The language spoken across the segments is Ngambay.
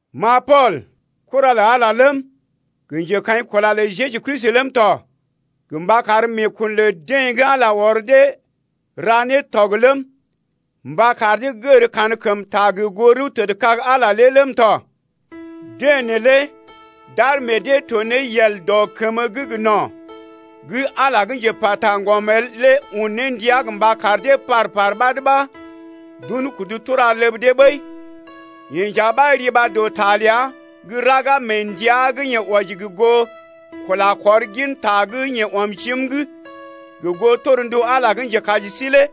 Ma Pool, kura lə Ala ləm, gə njekaḭkula lə Jeju Kristi ləm tɔ gə mba kar meekun lə dee gə́ Ala ɔr dee ra ne tɔg ləm, mba kar dee gər kankəmta gə goo rəw tədkag Ala lé ləm tɔ. Deḛ neelé d’ar meḛ dee to ne yel dɔ kəmə gə́ gə no̰ gə́ Ala gə́ njepa taŋgɔm el lé un ne ndia mba kar dee par-par ɓad ɓa d’un kudu tura ləb dee ɓəi. Yeḛ nja ɓa riba dɔ ta ləa gə́ raga mee ndəa gə́ yeḛ wɔji gə goo kula kɔr gin ta gə́ yeḛ ɔm jim’g gə goo torndu Ala gə́ njekaji sí lé.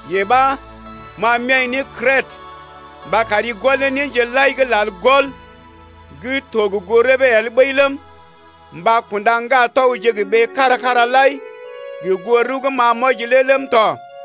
Yee ɓa ma m’ya̰’i ne Krètə mba kari gɔl néje lai gə́ lal gɔl gə́ to gə goo rəbee el ɓəi ləm, mba kunda ŋgatɔgje gə ɓee kára-kára lai gə goo rəw gə́ ma m’wɔji lé ləm tɔ.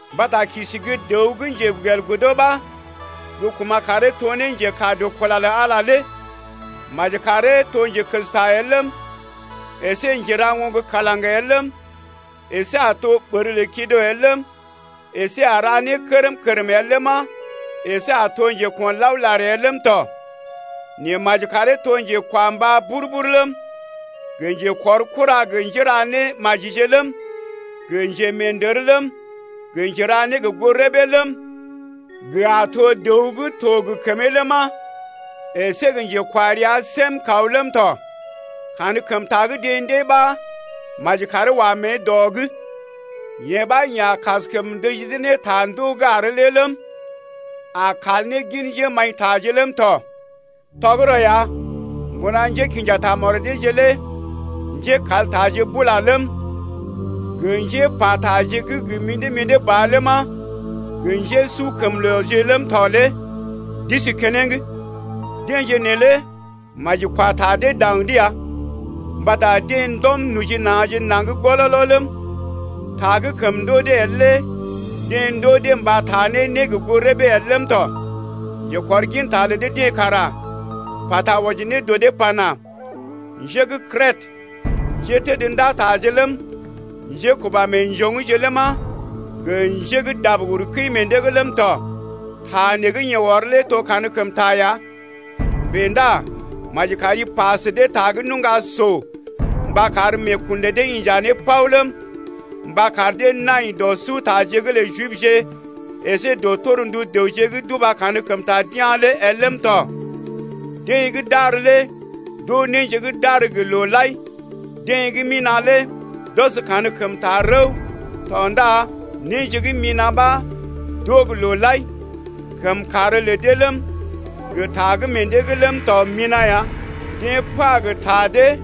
Mbata kisi gə́ dəw gə́ njegelgodo ɓa gə́ kuma̰ karee to ne njekaa dɔ kula lə Ala lé. Maji karee to njekəsta el ləm, əsé njera oŋg kalaŋ el ləm, əsé a to ɓər lə kido el ləm, əsé a ra né kərm-kərm el ləma, əsé a to njeko̰laolar el ləm tɔ. Nɛ maji karee to njekwambá bur-bur ləm, gə njekɔrkura gə njéra némajije ləm, gə njemeendər ləm, gə njera né gə́ gə goo rəbee ləm, gə a to dəw gə́ to gə kəmee ləma, əsé gə njekwarea səm kaw ləm tɔ. Kankəmta gə́ deḛ ndée ɓa maji karee wa mée dɔ’g, yee ɓa yeḛ a kaskəm ndəji dee ne ta ndoo gə́ àr lé ləm, a kal ne gin njémaḭtaje ləm tɔ. Tɔgərɔ ya, mbuna njékḭja tamɔd deeje lé njékaltaje bula ləm, gə njépa taje gə́ gə mḭdé-mḭdé ba ləma, gə njésukəmlooje ləm tɔ lé d’isi keneŋ. Deḛje neelé maji kwa ta dee daŋ’d ya. Mbata deḛ ndɔm noji na̰je naŋg gololo ləm, ta gə́ kəm ndoo dee el lé deḛ ndoo dee mba taa ne né gə́ gə goo rəbee el ləm tɔ. Njekɔrginta lə dee-deḛ kara pata wɔji ne dɔ dee pana: Njé gə́ Krètə, njétədndataje ləm, njékuba meḛjoŋgje ləma, gə njé gə́ dab uru kəi meḛ dee’g ləm tɔ. Ta nee gə́ yeḛ ɔr lé to gə́ kankəmta ya. Bèe ndá maji kari pa sə dee ta gə́ nuŋga so mba kar meekun lə dee inja ne paw ləm, mba kar dee nai dɔ sutaje’g lə Jibje əsé dɔ torndu dəwje gə́ d’uba kankəmta d’ya̰ lé el ləm tɔ. Deḛ gə́ d’àr lé d’oo néje gə́ d’àr gə́ looje lai. Deḛ gə́ mina̰ lé d’ɔs kankəmta rəw tɔ ndá néje gə́ mina̰ ɓa d’oo gə́ looje lai tɔ. Kəmkàr lə dee ləm, gə ta gə́ meḛ dee’g ləm tɔ lé mina̰ ya. Deḛ pa gə ta dee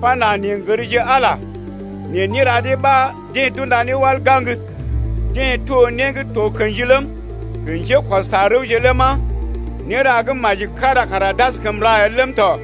pana: Neḛ n’gərje Ala, nɛ néra dee ɓa deḛ d’unda ne wal gaŋg. Deḛ to né gə́ to kḛji ləm, gə njékɔs ta rəwje ləma, néra gə́ maji kára kara d’askəm ra el ləm tɔ.